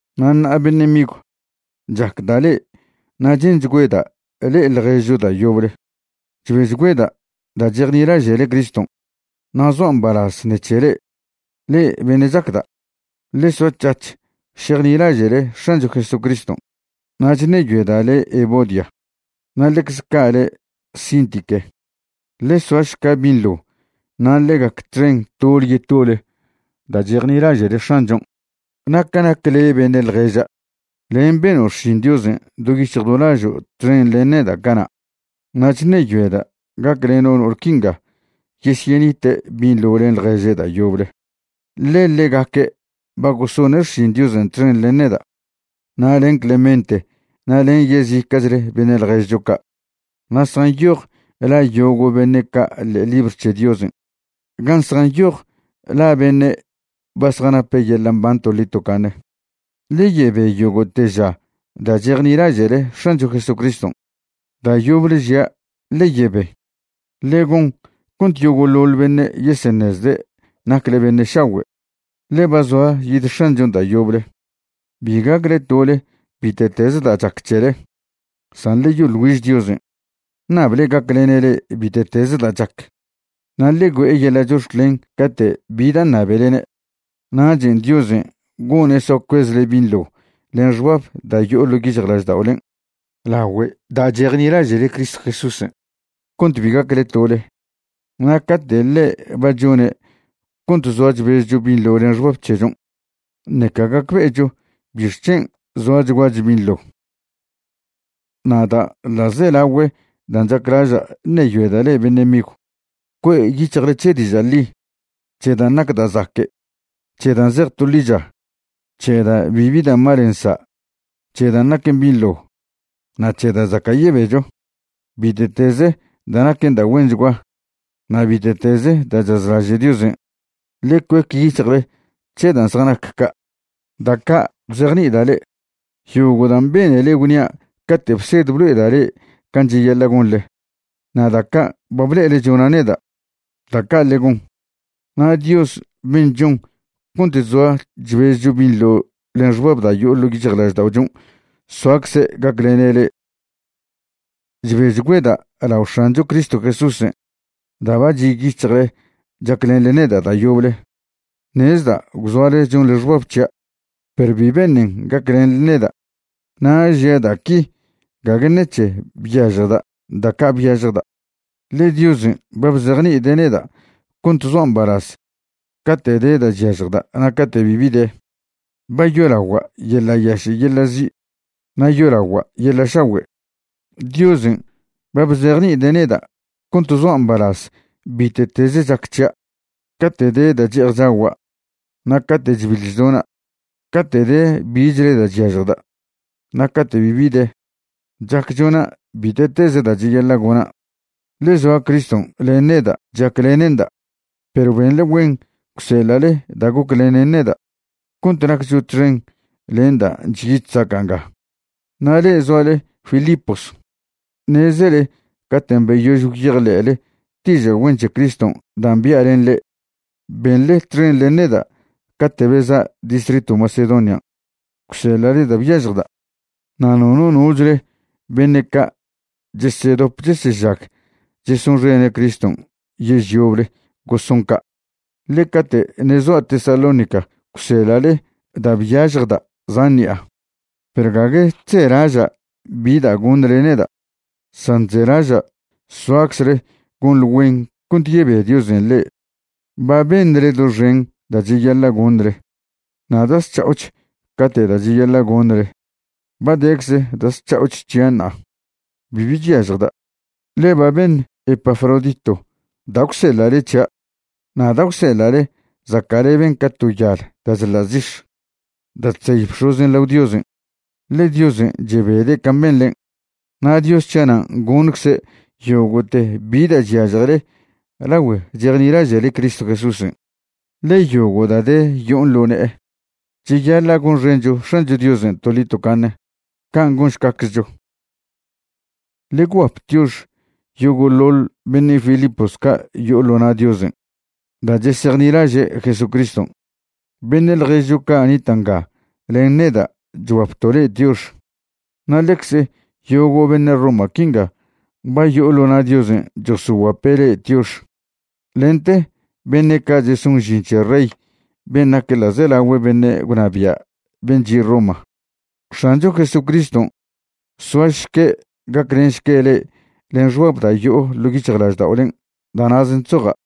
Na' ṉa'a beṉe' migw, chacda' le'e na' che'nchgüeda' le'e ḻježcho da' yoble. Chbechgüeda' da' chejnilaže'le Criston', na' zoa' mbalaz ṉec̱he le'e. Le'e beṉe' chacda', ḻe soac̱hac̱h šejnilaže'le X̱ancho Jesucriston'. Na' chṉeyoeda' le' Evodia, na' ḻecze ca' le' Síntique, ḻe soašca binḻo na' ḻe gac txen tole yetole da' chejnilaže'le X̱anchon'. Na' ca nac le' beṉe' ḻježa', len' beno' xšin Diosen' do yic̱hj do lažo' txen len neda' cana', na' chṉeyoeda' gacleno' no'ol quinga yesyenite' binḻo len ḻježe' da' yoble, ḻe ḻegaque' ba gosone' xšin Diosen' txen len neda' na' len Clemente na' len yezica'chle beṉe' ḻježcho ca', na' zjanyoj la yogo' beṉe' ca' ḻe'e libr c̱he Diosen' gan' zjanyoj la beṉe' ba zjanape' yeḻa' mban toḻi tocaṉe. Ḻe yebe yogo'te ža da' chejnilaže'le X̱ancho Jesucriston'. Da' yoble žia', ḻe yebe. Ḻe gon cont yogo'ḻoḻ beṉe' yeseṉezde' nacle beṉe' šagüe', ḻe ba zoa yid X̱anchon' da' yoble. Bi gacle tole bite'teze da' chac c̱hele, san ḻe yoḻ güiž Diosen', ṉable gaclene' le'e bite'teze da' chac, na' ḻe güe'e yeḻa' chox̱clen cate' bi da' ṉabelene'. Nachen' Diosen' gone' soa cuezle binḻo len xbab da' yo'o ḻo' yic̱hjlažda'olen' lagüe da' chejnilaže'le Cristo Jesúsen', cont bi gacle tole. Na' cate' ḻe' ba chone' cont zoa chbezcho binḻo len xbab c̱hechon', ṉeca gacbe'echo bixc̱hen' zoachguacho binḻo. Na' da' ḻa'zelagüe dan' chaclaža' ṉeyoeda' le'e beṉe' migw, cue' yic̱hjle c̱he diža' ḻi, c̱he dan' nac da' zaque', c̱he dan' zej to ḻicha, c̱he dan' bibi da' mal nsa', c̱he dan' naquen binḻo, na' c̱he da' zaca' yebecho. Bite'teze da' naquen da' güenchgua na' bite'teze da' chazlaže' Diosen', ḻe cuec yic̱hjle c̱he dan' zjanac ca'. Da' ca' bzejni'ida' le'e, yogo' dan' benele gwnia' cate' bsed blo'eda' le'e can' cheyaḻa' gonḻe, na' da' ca' ba ble'ele chona' neda', da' ca' ḻe gon. Na' Dios ben' chon cont chzoa chbezcho binḻo len xbab da' yo'o ḻo' yic̱hjlažda'ochon' soacze' gaclene' le'e. Chbechgüeda' lao X̱ancho Cristo Jesúsen' da' ba chi' yic̱hjle chaclenḻe neda' da' yoble. Ṉezda' gwzoale chonḻe xbab c̱hia', perw bi beṉen gaclenḻe neda'. Na' žia' da' qui gague ṉec̱he byažjda' da' ca' byažjda', ḻe Diosen' ba bzejni'ide' neda' cont zoa' mbalaz cate' de da' chyažjda' na' cate' bibi de. Ba yolagua' yeḻa' yaše' yeḻa' zi', na' yolagua' yeḻa' šagüe'. Diosen' ba bzejni'ide' neda' cont zoa' mbalaz bite'teze chac c̱hia', cate' de da' che'ej chagua' na' cate' chbiḻ chdona', cate' de bichle da' chyažjda' na' cate' bibi de. Chac chona' bite'teze da' cheyaḻa' gona', ḻe zoa Criston' len neda' chaclene'nda'. Perw benḻe güen gwseḻa'le da' goclenen neda' cont naccho txen len dan' chyi chzaca' nga. Na' le'e zoale Filipos, ṉezele caten' beyož gwyejḻe'le diža' güen c̱he Criston' dan' bia' len le'e, benḻe txen len neda' cate' beza' distritw Macedonian', gwseḻa'le da' byažjda', na' nono nochle beṉe' ca' chesedop chesežag chesonxene' Criston' yež yoble goson ca'. Ḻe cate' ṉe' zoa' Tesalónica gwseḻa'le da' byažjda' zan ṉi'a. Perw gague chzelaža' bi da' goṉle neda', san chzelaža' soaczle gonḻe güen cont yebe Diosen' le'e. Ba beṉle doxen da' cheyaḻa' goṉle na' da' zc̱ha'och ca'te' da' cheyaḻa' goṉle. Ba decze da' zc̱ha'o c̱hia' ṉa'a. Bibi chyažjda', ḻe ba beṉ Epafrodito da' gwseḻa'le c̱hia'. Na' da' gwseḻa'le zaca'leben ca to yal da' chḻa' zix̱ da' chzey bx̱ozen' lao Diosen', ḻe Diosen' chebede' can' benḻen'. Na' Dios c̱hia' nan' goṉcze' yogo'te bi da' chyažjele lagüe chejnilaže'le Cristo Jesúsen', ḻe yogo' da' de yo'on ḻo ne'e. Cheyaḻa' gonxencho X̱ancho Diosen' toḻi tocaṉe. Can' gonšcaczcho. Ḻe gwguap tiox yogo'ḻoḻ beṉe' Filipos ca' yo'o ḻo na' Diosen' da' chesejnilaže' Jesucriston'. Beṉe' ḻježcho ca' nita' nga len neda' chguapto' le'e tiox. Na' ḻecze yogo' beṉe' Roma quinga ba yo'o ḻo na' Diosen' chosoguape' le'e tiox, lente beṉe' ca' cheson žin c̱he rey ben' nac ḻa'zelagüe' beṉe' gwnabia' ben' chi' Roma. X̱ancho Jesucriston' soašque' gaclenšque' le'e len xbab da' yo'o ḻo' yic̱hjlažda'olen'. Da' na'zen' chzoja'.